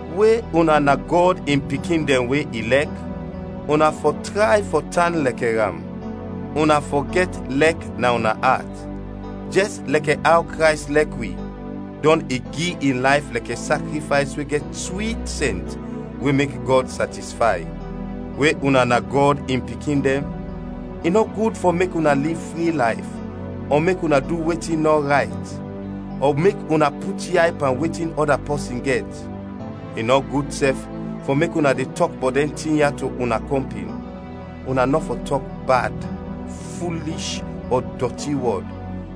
We una na Gɔd in pikin dɛn we i lɛk, una fɔ tray fɔ tan lɛkɛ am. Una fɔ gɛt lɛk na una at, jɛs lɛkɛ aw Krays lɛk wi, dɔn i gi in layf lɛkɛ sakrifays we gɛt swit sɛnt we mek Gɔd satisfay. We una na Gɔd in pikin dɛn, i nɔ gud fɔ mek una liv fri layf, ɔ mek una du wetin nɔ rayt, ɔ mek una put yay pan wetin ɔda pɔsin gɛt; i nɔ gud sɛf fɔ mek una de tɔk bɔt dɛn tin ya to una kɔmpin. Una nɔ fɔ tɔk bad, fulish, ɔ dɔti wɔd,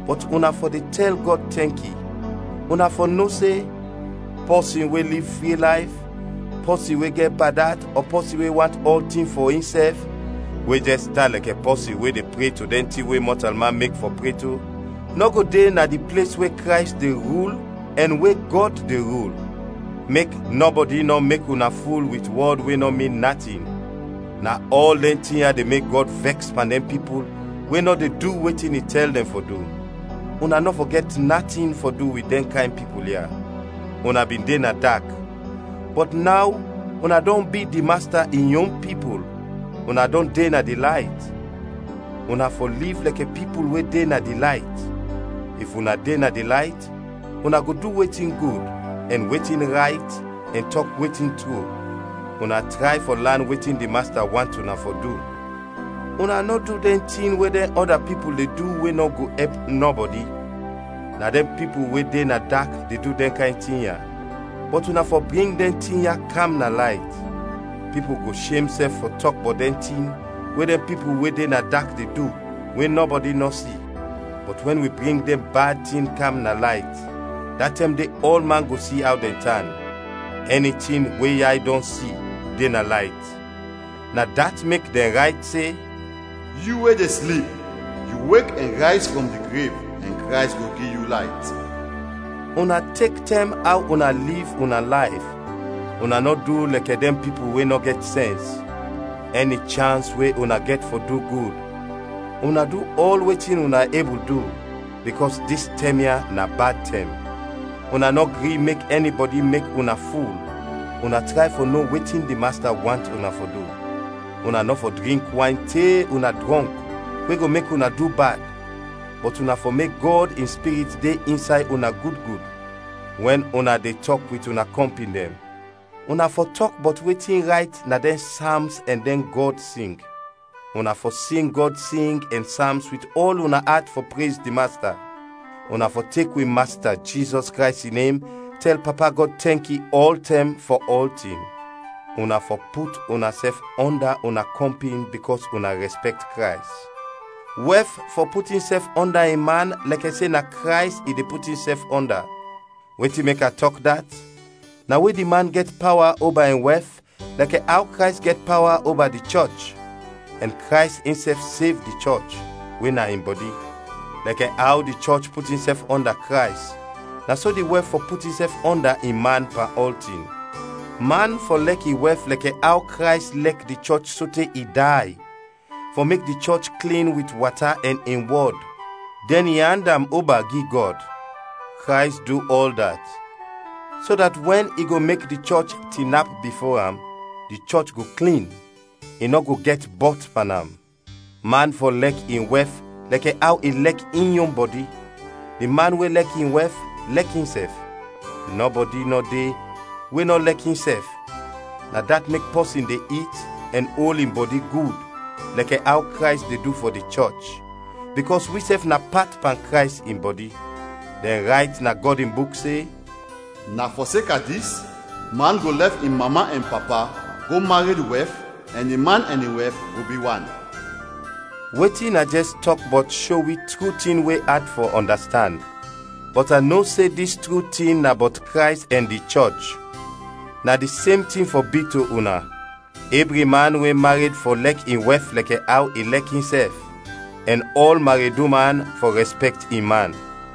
bɔt una fɔ de tɛl Gɔd tɛnki. Una fɔ no se: pɔsin we liv fri layf, pɔsin we gɛt bad at, ɔ pɔsin we want ɔltin fɔ insɛf (we jɛs tan lɛkɛ pɔsin we de pre to dɛn tin we mɔtalman mek fɔ pre to) nɔ go de na di ples we Krays de rul ɛn we Gɔd de rul. Mek nɔbɔdi nɔ mek una ful wit wɔd we nɔ min natin, na ɔl dɛn tin ya de mek Gɔd vɛks pan dɛn pipul we nɔ de du wetin i tɛl dɛn fɔ du. Una nɔ fɔ gɛt natin fɔ du wit dɛn kayn pipul ya. Una bin de na dak, bɔt naw una dɔn bi di Masta in yon pipul, una dɔn de na di layt, una fɔ liv lɛkɛ pipul we de na di layt. If una de na di layt, una go du wetin gud, ɛn wetin rayt ɛn tɔk wetin tru. Una tray fɔ lan wetin di Masta want una fɔ du. Una nɔ du dɛn tin we dɛn ɔda pipul de du we nɔ go ɛp nɔbɔdi, na dɛn pipul we de na dak de du dɛn kayn tin ya; bɔt una fɔ bring dɛn tin ya kam na layt. Pipul go shem sɛf fɔ tɔk bɔt dɛn tin we dɛn pipul we de na dak de du, we nɔbɔdi nɔ si. Bɔt wɛn wi bring dɛn bad tin kam na layt, da tɛm de ɔlman go si aw dɛn tan. Ɛni tin we yay dɔn si, de na layt. Na dat mek dɛn rayt se, “Yu we de slip, yu wek, ɛn rayz frɔm di grev, ɛn Krays go gi yu layt.” Una tek tɛm aw una liv una layf, una nɔ du lɛkɛ dɛn pipul we nɔ gɛt sɛns. Ɛni chans we una gɛt fɔ du gud, una du ɔl wetin una ebul du, bikɔs dis tɛm ya na bad tɛm. Una nɔ gri mek ɛnibɔdi mek una ful, una tray fɔ no wetin di Masta want una fɔ du. Una nɔ fɔ drink wayn te una drɔnk we go mek una du bad, bɔt una fɔ mek Gɔd in Spirit de insay una gud gud. Wɛn una de tɔk wit una kɔmpin dɛn, una fɔ tɔk bɔt wetin rayt na dɛn Sams ɛn dɛn Gɔd sing. Una fɔ sing Gɔd sing ɛn Sams wit ɔl una at fɔ prez di Masta. Una fɔ tek wi Masta Jizɔs Krays in nem tɛl Papa Gɔd tɛnki ɔltɛm fɔ ɔltin. Una fɔ put unasɛf ɔnda una kɔmpin bikɔs una rɛspɛkt Krays. Wɛf fɔ put insɛf ɔnda in man lɛkɛ se na Krays i de put insɛf ɔnda. Wetin mek a tɔk dat, na we di man gɛt pawa oba in wɛf lɛkɛ aw Krays gɛt pawa oba di chɔch, ɛn Krays insɛf sev di chɔch, we na in bɔdi. Lɛkɛ aw di chɔch put insɛf ɔnda Krays, na so di wɛf fɔ put insɛf ɔnda in man pan ɔltin. Man fɔ lɛk in wɛf lɛkɛ aw Krays lɛk di chɔch sote i day, fɔ mek di chɔch klin wit wata ɛn in wɔd, dɛn i and am oba gi Gɔd. Krays du ɔl dat, so dat wɛn i go mek di chɔch tinap bifo am, di chɔch go klin, i nɔ go gɛt bɔt pan am. Man fɔ lɛk in wɛf lɛkɛ aw i lɛk in yon bɔdi. Di man we lɛk in wɛf, lɛk insɛf. Nɔbɔdi nɔ de we nɔ lɛk insɛf, na dat mek pɔsin de it ɛn ol in bɔdi gud, lɛkɛ aw Krays de du fɔ di chɔch; bikɔs wisɛf na pat pan Krays in bɔdi. Dɛn rayt na Gɔd in Buk se, “Na fɔseka dis, man go lɛf in mama ɛn papa, go mared wɛf ɛn di man ɛn in wɛf go bi wan.” Wetin a jɛs tɔk bɔt sho wi tru tin we at fɔ ɔndastand, bɔt a no se dis tru tin na bɔt Krays ɛn di chɔch. Na di sem tin fɔ bi to una: ɛbri man we mared fɔ lɛk in wɛf lɛkɛ aw i lɛk insɛf, ɛn ɔl mared uman fɔ rɛspɛkt in man.